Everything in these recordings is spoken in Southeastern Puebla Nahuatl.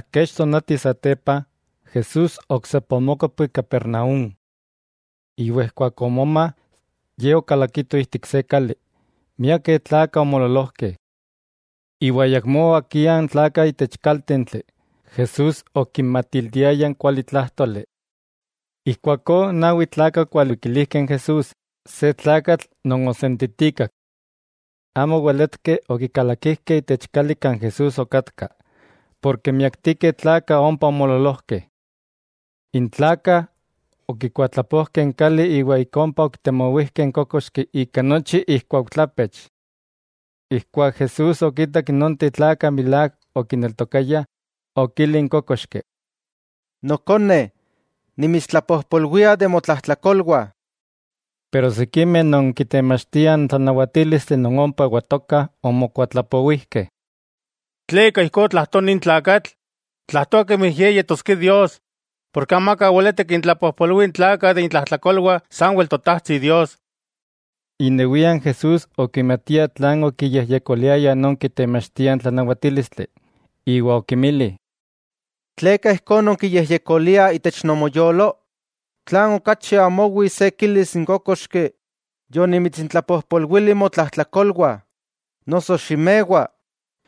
Kech tonati satepa, Jesús oksepa omókopki Capernaúm. Iwa ijkuak omoma ye okalakito ijtik se kali, miakeh tlakah omoololojkeh. Iwa ayakmó oakiah n tlakah itech kaltentli, Jesús okinmatiltiaya n kualitlájtoli. Ijkuakó nawi tlakah okwalikilijkeh n Jesús se tlakatl non osentitikak. Amo oweletkeh okikalakijkeh itech kali kan Jesús okatka, porke miaktikeh tlakah ompa omoololojkeh. N tlakah okikuatlapojkeh n kali iwa ik ompa okitemowijkeh n kókoxki ika nochi ikuaujtlapech. Ijkuak Jesús okitak nonteh tlakah milák okineltokayah, okili n kókoxki: —Nokone, nimitstlapojpolwia de motlajtlakolwah. Pero sikimeh non kitemachtiah n tlanawatílistli non ompa oewatokah, omokuatlapowijkeh: “¿Tleka ijkó tlajtoa nin tlakatl?, tlajtoa kemi Ye yetoskia Dios, porke amaka weleti kintlapojpolwia n tlakah de intlajtlakolwah, sanwel Totajtsi Dios.” Inewia Jesús okimatia tlan okiyejyekoliayah non kitemachtiah n tlanawatílistli, iwa okinmili: —¿Tleka ijkó nonkiyejyekoliah itech nomoyolo? ¿Tlan okachi amo owi se kilis n kókoxki: “Yonimitsintlapojpolwili motlajtlakolwah”, noso: “Ximewa,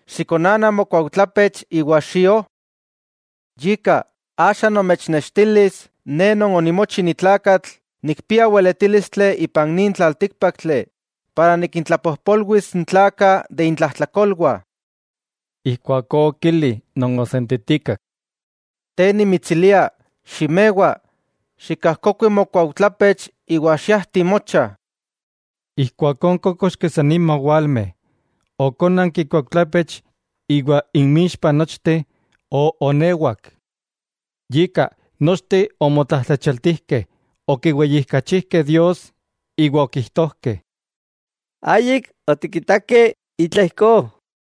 xikonana mokuaujtlapech iwa xio?” Yika, axa nomechnextilis Ne Non onimochi ni tlakatl, nikpia weletílistli ipan nin tlaltíkpaktli para nikintlapojpolwis n tlakah de intlajtlakolwah. Ijkuakó okili non osentitikak: —Te nimitsilia, ximewa, xikajkokui mokuaujtlapech iwa xiajti mocha. Ijkuakó n kókoxki san nima owalme, okónanki ikuaujtlapech iwa inmixpa nochteh, oonewak. Yika, nochteh omotlajtlachialtijkeh, okiweyijkachijkeh Dios, iwa okijtojkeh: —¡Ayik otikitakeh itla ijkó!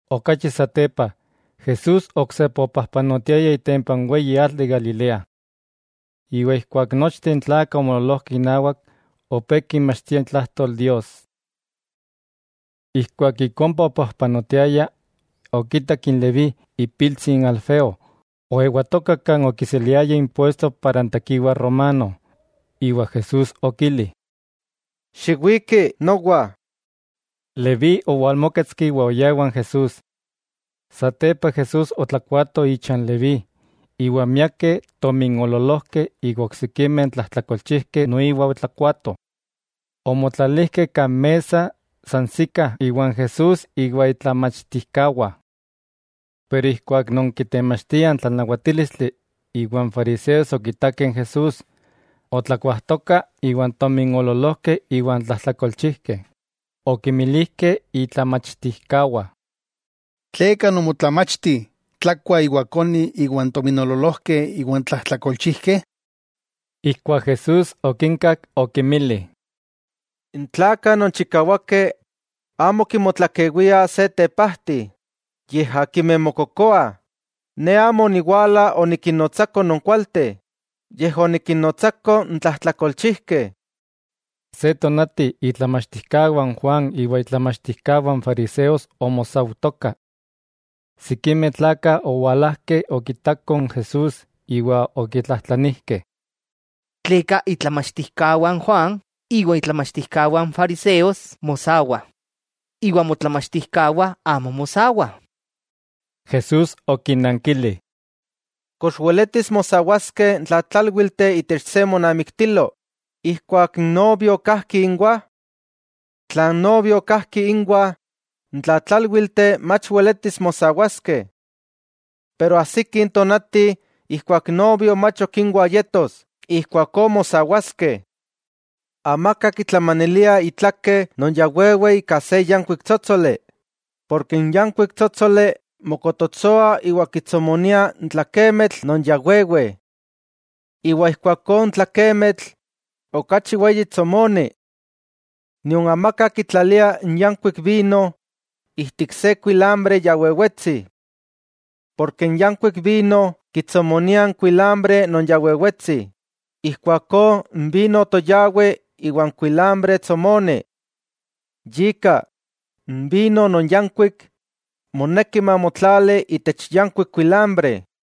Okachi satepa Jesús oksepa opajpanotiaya itempa n weyi atl de Galilea. Iwa ijkuak nochteh n tlakah omoololojkeh inawak, opé kinmachtia itlajtol Dios. Ijkuak ik ompa opajpanotiaya, okitak n Leví ipiltsi n Alfeo, oewatoka kan okiseliaya impuesto para n tekiwa romano iwa Jesús okili: —Xiwiki nowa. Leví owalmóketski iwa oyá iwan Jesús. Satepa Jesús otlakuato icha n Leví, iwa miakeh tominoololojkeh iwa n oksikimeh tlajtlakolchijkeh noiwa otlakuatoh, omotlalijkeh kan mesa sansikah iwan Jesús iwa itlamachtijkawah. Pero ijkuak non kitemachtiah n tlanawatílistli iwa n fariseos okitakeh n Jesús otlakuajtoka iwan tominoololojkeh iwan tlajtlakolchijkeh, okinmilijkeh itlamachtijkawah: —¿Tleka nomotlamachti tlakua iwa koni iwan tominoololojkeh iwan tlajtlakolchijkeh? Ijkuak Jesús okinkak okinmili: —N tlakah non chikawakeh amo kimotlakewiah se tepajti, yej akimeh mokokoah. Ne amo oniwala onikinnotsako non kualteh, yej onikinnotsako n tlajtlakolchijkeh. Se tonati itlamachtijkawah n Juan iwa itlamachtijkawah n fariseos omosaujtokah. Sikimeh tlakah owalajkeh okitakoh n Jesús iwa okitlajtlanijkeh: —¿Tleka itlamachtijkawah n Juan iwa itlamachtijkawah n fariseos mosawah, iwa motlamachtijkawah amo mosawah? Jesús okinnankili: —¿Kox weletis mosawaskeh n tlatlálwilteh itech se monamiktilo ijkuak n novio kajki inwah? Tla n novio kajki inwah, n tlatlálwilteh, mach weletis mosawaskeh. Pero ajsiki tonati ijkuak n novio mach ok inwah yetos, ijkuakó mosawaskeh. 'Amaka kitlamanilia itlake non ya wewe ika se yankuik tsótsoli, porke n yankuik tsótsoli mokototsoa iwa kitsomonia n tlakemitl non ya wewe. Ijkuakó n tlakemitl, okachi weyi tsomoni. Nion amaka kitlalia n yankuik vino ijtik se kuilambre ya wewetsi. Porke n yankuik vino kitsomonia n kuilambre non ya wewetsi, ijkuakó n vino toyawi iwa n kuilambre tsomoni. Yika, n vino non yankuik, moneki mamotlali itech yankuik kuilambre.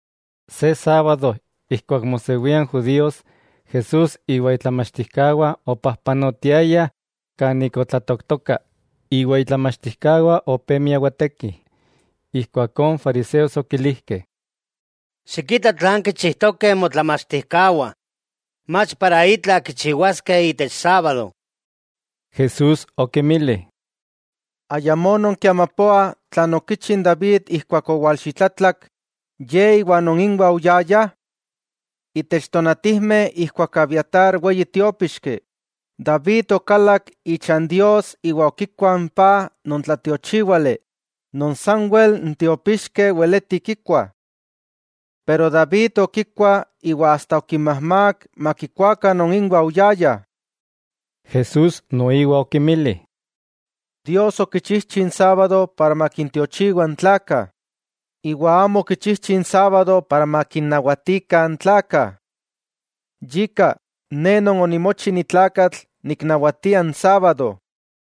Se sábado ijkuak mosewia n judíos, Jesús iwa itlamachtijkawah opajpanotiayah kan ik otlatooktoka, iwa itlamachtijkawah opé miawatekih. Ijkuakó n fariseos okilijkeh: —Xikita tlan kichijtokeh motlamachtijkawah, mach para itla kichiwaskeh itech sábado. Jesús okinmili: —¿Ayamó nonkiamapoah tlan okichi n David ijkuak owalxitlatlak, ye iwa non inwah oyayah? Itech tonatijmeh ijkuak Abiatar weyi tiópixki, David okalak ichan Dios iwa okikua n paj non tlatiochíwali, non sanwel n tiópixkeh weleti kikuah. Pero David okikua iwa asta okinmajmák makikuakah non inwa oyayah. Jesús noiwa okinmili: —Dios okichijchi n sábado para makintiochiwa n tlakah, iwa amo okichijchi n sábado para makinnawatikah n tlakah. Yika, Ne Non onimochi ni tlakatl niknawatia n sábado.